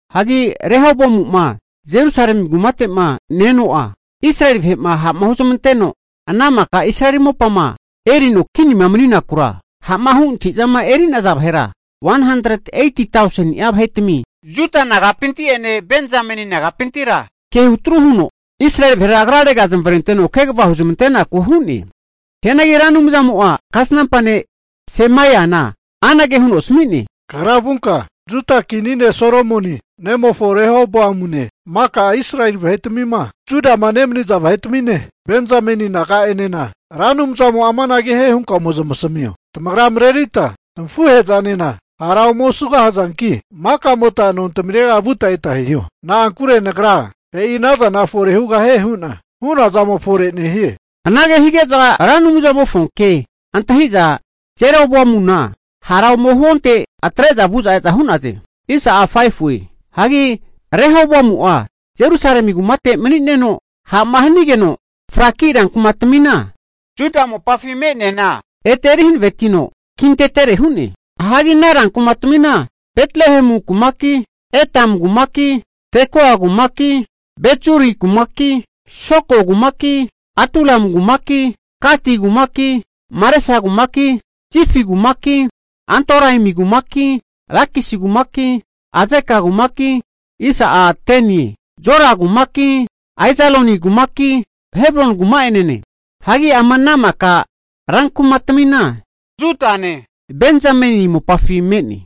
Hagi Rehoboamu'ma Jerusalemi kumate'ma ne-eno'a, Israeli vahe'ma ha'ma huzmanteno ana maka Israeli mopama erino kinima mani'nakura, ha'ma hu antahi'zama eri'naza vahera 180tauseni'a vahetami Juda nagapinte'ene Benzameni nagapintira ke hutru huno, Israeli vahera agrarega zamavarenteno kegava huzmantenaku hu'ne. Hianagi Ra Anumzamo'a kasnampa ne' Semaiana anage huno asami'ne, Kagra vunka, Juda kini ne' Solomoni nemofo Rehoboamune, maka Israeli vahetamima Judama nemaniza vahetamine, Benzameni naga'enena, Ra Anumzamo'a amanage hie hunka ome zamasamio, tamagra marerita tamafuhe'zanena hara ome osugahazanki, makamota nontamirega vuta eta hiho. Na'ankure Nagra e'ina zana fore hugahie hu'na hu'noazamo fore nehie. Anage hige'za Ra Anumzamofonke antahi'za Jeroboamuna hara ome huonte atre'za vu'za e'za hu'naze. Hagi Rehoboamu'a Jerusalemi kumate mani'neno ha'ma hanigeno fraki rankumatamima Juda mopafi me'neana ete eri hanavetino kintetere hu'ne. Hagi ana rankumatamina Betlehemu kumaki, Etam kumaki, Tekoa kumaki, Bet-zuri kumaki, Soko kumaki, Adulamu kumaki, Gati kumaki, Maresa kumaki, Zifi kumaki, Adoraimi kumaki, Lakisi kumaki, Azeka kumaki, Zora kumaki, Aijaloni kumaki Hebroni kuma'enene. Hagi ama ana mika rankumatamina Judane, Benzameni mopafi me'ne.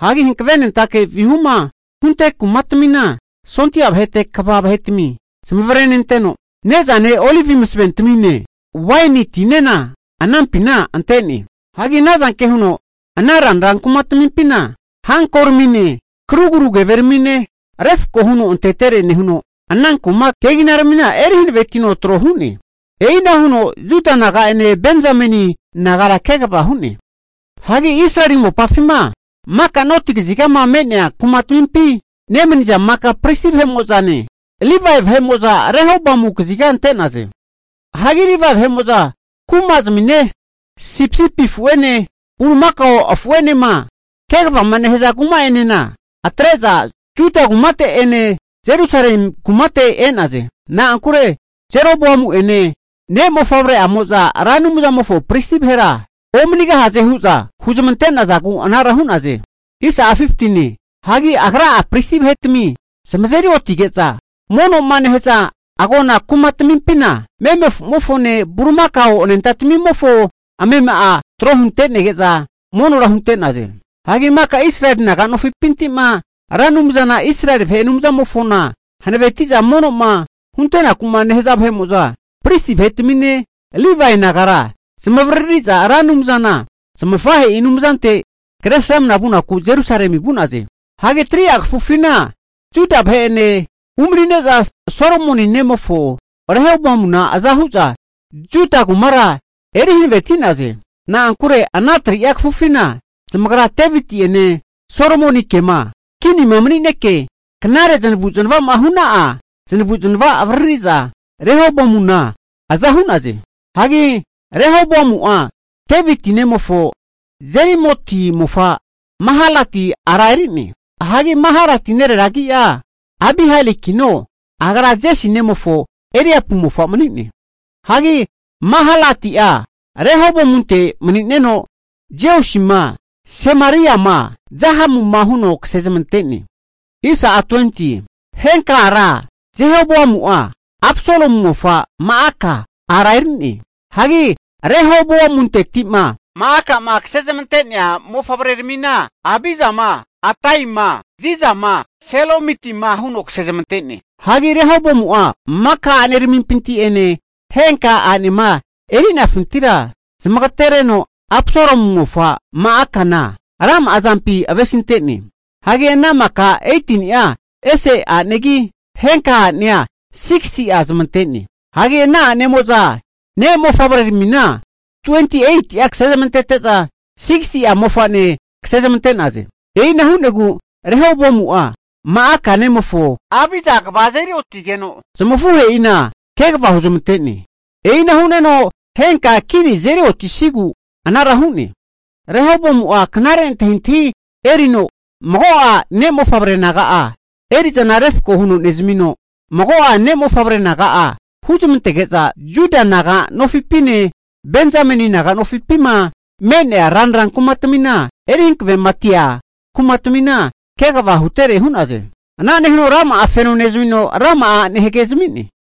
Hagi hankavenentake vihuma hunte kumatamimpina sondia vahete kva vahetami zamavarenenteno, ne'zane olivi masaventamine, waini tinena anampina ante'ne. Hagi anazanke huno ana ranra kumatamimpina hankoramine, karugru keveramine, refko huno antetere nehuno, ana kuma keginaramina eri hanavetino tro hu'ne. E'ina huno Juda naga'ene Benzameni naga'enena kegava hu'ne. Hagi Israeli mopafima maka noti kazigama me'nea kumatamimpi nemani'za maka pristi vahe'mo'zane, Livae vahe'mo'za Rehoboamu kazigage ante'naze. Hagi Livae vahe'mo'zane kumazamine, sipisipi afu'ene bulimakao afu'enema kegavama nehaza kuma'enena atre'za, Juda kumate'ene Jerusalemi kumate e'naze. Na'ankure Jeroboamu'ene ne' mofavre'amoza Ra Anumzamofo pristi vahera omanigahaze hu'za huzmante'nazagu arara hu'naze. Hagi agra'a pristi vahetami zamazeri otige'za mono'ma nehaza agona kumatamimpina meme afu'mofone bulimakao anentamofo amema'a tro hunte'nege'za monora hunte'naze. Hagi maka Israeli vahe'mo'za naga nofipinti'ma Ra Anumzana Israeli vahe Anumzamofona hanaveti'za mono'ma huntenaku'ma nehaza vahe'mo'zane, pristi vahetamine Livae nagara zamavariri'za Ra Anumzana zamafahe'i Anumzante kresramna vunaku Jerusalemi vu'naze. Hagi 3'a kafufina Juda vahe'ene umani'neza Solomoni nemofo Rehoboamuna aza hu'za Juda kumara eri hanaveti'naze. Na'ankure ana 3'a kafufina zamagra Deviti'ene, Solomonikema kinima manineke knare zanavu'zanava hu'na'a zanavu'zanava avariri'za, Rehoboamuna aza hu'naze. Hagi Rehoboamu'a, Deviti nemofo Jerimoti mofa Mahalati ara eri'ne. Hagi Mahalati nerera agi'a Abihailikino agra Jesi nemofo Eliapu mofa mani'ne. Hagi Mahalati'a Rehoboamunte mani'neno, Jeusima, Semariama Zahamuma huno kasezmante'ne. Henka ara Jehoboamu'a Absalomu mofa Ma'aka ara eri'ne. Hagi Rehoboamunteti'ma Ma'akama kasezmante'nea mofavreramina Abijama, Ataima, Zizama, Selomitima huno kasezmante'ne. Hagi Rehoboamu'a maka ane'aramimpinti'ene henka a'nema erinefintira zamagatereno Absalomu mofa Ma'akana rama'azampi avesinte'ne. Hagi ana maka 18ni'a ese a'negi henka a'nea 60'a zamante'ne. Hagi ana a'nemo'za ne' mofavreramina 28'a kasezmante'za 60'a mofane kasezamante'naze. E'ina hu'negu Rehoboamu'a Ma'aka nemofo Abija kva azeri otigeno, zamafuhe'ina kegava huzmante'ne. E'ina hu'neno henka kini azeri otisigu anara hu'ne. Rehoboamu'a knare antahintahi erino mago'a ne' mofavre naga'a eri'zana refko huno nezamino, mago'a ne'mofavre naga'a huzmantege'za Juda naga mopafine, Benzameni naga mopafi'ma me'nea ranra kumatamima eri hankavematia kumatamina kegava hutere hu'naze. Ana nehuno rama'a feno nezmino, rama'a a'ne hagezami'ne.